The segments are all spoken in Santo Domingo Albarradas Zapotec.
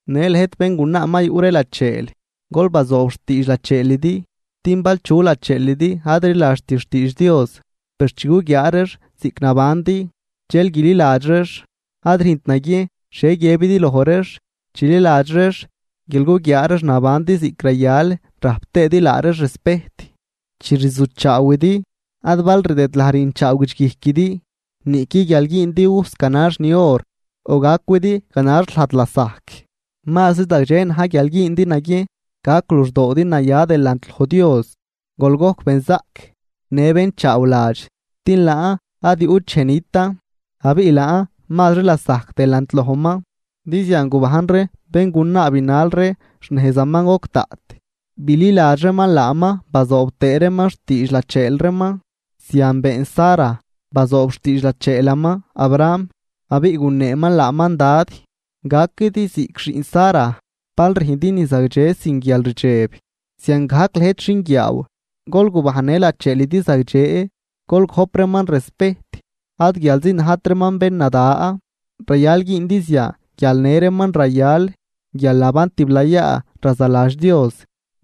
Në lëjt béngunaa ma yuꞌ ree lacheel, gol bazoob xtiidx lacheelidi, din bal chu lacheelidi ad rliladxt xtiidx Dios, per chi guguiaa reex ziꞌc nabandi, dxel guililadx reex. Ad rüjnt naguiejn xhie guiëbidi loj reex, chililadx reex guial guguiaa reex nabandi ziꞌc rayal rajp tëëdi laa reex respejt. Chi rzujchaawidi, ad bal rdëdlaj rüjnchaaw guidxguijquidi niꞌqui guial güündi ujs ganax ni or o gacwidi ganax lajd lasajc. Mazri zagdxe na̱j guial güündi naguiejn gac luxdoodi naya delant loj Dios, gol gojc benzaꞌc në bén chaawladx, din laan ad yuꞌt dxej nitan, abiꞌ laan mazri lasajc delant lojman. Din zian gubajn ree béngunaa binal ree xnejzaman goc daꞌt, bililadx reeman laaman bazoob tëë reeman xtiidx lacheel reeman. Zian been Sara, bazoob xtiidx lacheelaman Abraham, abiꞌ guneeman laaman “Dad”. Gaquidi ziꞌc xiꞌn Sara, bal rüjndi ni zagdxe sin guialrdxeb. Ziangajc lëjt xinguiaaw, gol gubajnnë lacheelidi zagdxe, gol gojp reeman respejt ad guialzi najt reeman bén nada, rayal güündi zian guial në reeman rayal guialnaban tiblayaa razaladx Dios,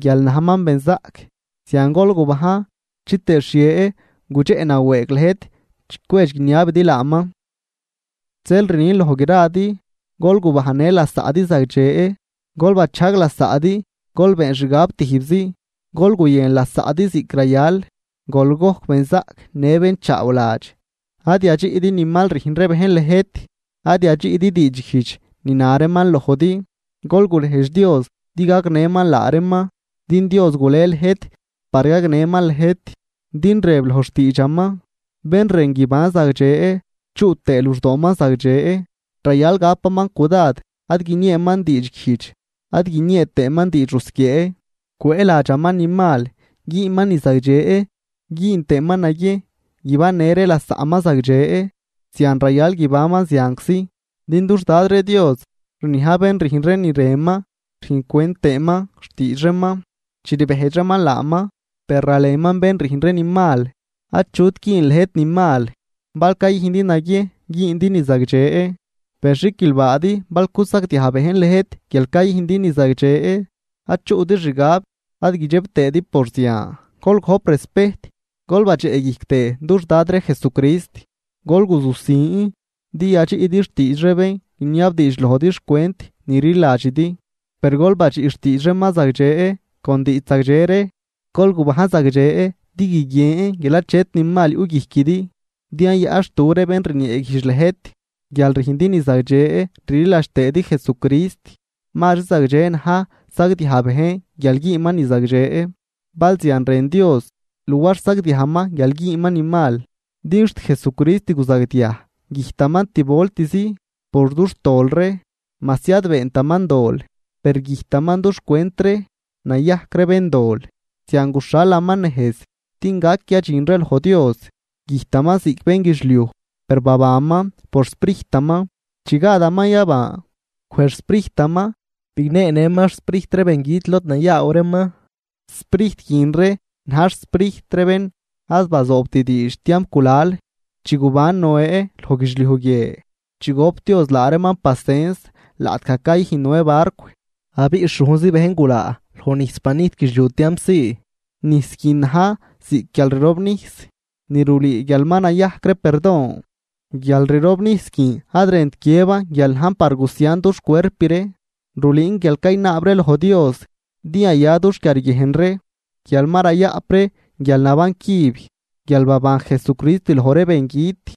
guial najman benzaꞌc. Zian gol gubajn, chitëë xhie gudxeꞌ nawëëg lëjt chi cwedx guiniabidi laaman. Zeel rnin loj gradi: Gol gubajnnë lasaꞌdi zagdxe, gol bachajg lasaꞌdi, gol been xgab tijbzi, gol guyën lasaꞌdi ziꞌc rayal, gol gojc benzaꞌc në bén chaawladx. Ad yadxiꞌdi ni mal rüjn ree bejn lëjt, ad yadxiꞌdi diidxguijdx ni na reeman lojdi, gol gurejdx Dios din gagnëman laa reeman, din Dios gulej lëjt par gagnëman lëjt. Din rëb loj xtiidxaman: Bén rën guiban zagdxe chuꞌ tëë luxdooman zagdxe, rayal gapaman cudad ad guinieeman diidxguijdx ad guiniee tëëman diidx rusquiee. Cwëëladxaman ni mal, güünman ni zagdxe güün tëëman naguiejn guibannë ree lasaꞌman zagdxe, zian rayal guibanman zianczi. Din dux Dad ree Dios rniaj bén rüjn ree ni rënman rüjncwent tëëman xtiidx reeman chi rbejdx reeman laaman, per ralenman bén rüjn ree ni mal. Achut güün lëjt ni mal, bal cayüjndi naguiejn güündi ni zagdxe. Per xiquilbaadi bal cusagdiaj bejn lëjt guial cayüjndi ni zagdxe. Ad chuꞌdi xgab ad guidxeb tëëdi por zian, gol gojp respejt gol badxeꞌguijc tëë dux Dad ree Jesucrist. Gol guzujsin din yadxiꞌdi xtiidx ree bén guiniabdiidx lojdi xcwent ni rliladxidi, per gol badxiꞌ xtiidx reeman zagdxe con diidx zagdxe ree. Gol gubajn zagdxe din guiguien guial achet ni mal yuꞌguijquidi din yayaꞌnxtu ree bén rnieeguijdx lëjt, guial rüjndi ni zagdxe rliladx tëëdi Jesucrist. Mazri zagdxe na̱j sagdiaj bejn guial güünman ni zagdxe, bal zian rën Dios, luar sagdiajman guial güünman ni mal. Din xt Jesucrist guzagdiaj, güjtaman tib voltzi por dux tol ree majsi ad beentaman dol, per güjtaman duxcwent ree nayajc ree béndol, zian guxhalaman nejz din gac yadxin ree loj Dios, güjtaman ziꞌc bénguidxliuj per babanman por xSprijtaman. Chi gadaman yaban, wej xSprijtaman bigneenëman xsprijt ree bengüt lod nayaaw reeman. Sprijt guin ree na̱j xsprijt ree bén ad bazoobt diidx tiamp gulal, chi guban Noé loj guidxliuj guie, chi gop Dios laa reeman pasens laꞌtgaj cayüjn Noé barcw, abiꞌ xhujnzi bejn gulaa loj nijs banijt guidxliuj tiamp zii. Nijs guin na̱j ziꞌc guialrirobnijs ni rulüü guial ma nayajc ree perdon. Guialrirobnijs guin ad rënt guiëban guial najn par gusian dux cuerp ree, rulüün guial caynaab ree loj Dios din yaya dux quiarguiejn ree, guial ma rayaꞌp ree guialnaban cüb guial baban Jesucrist loj ree bengüt,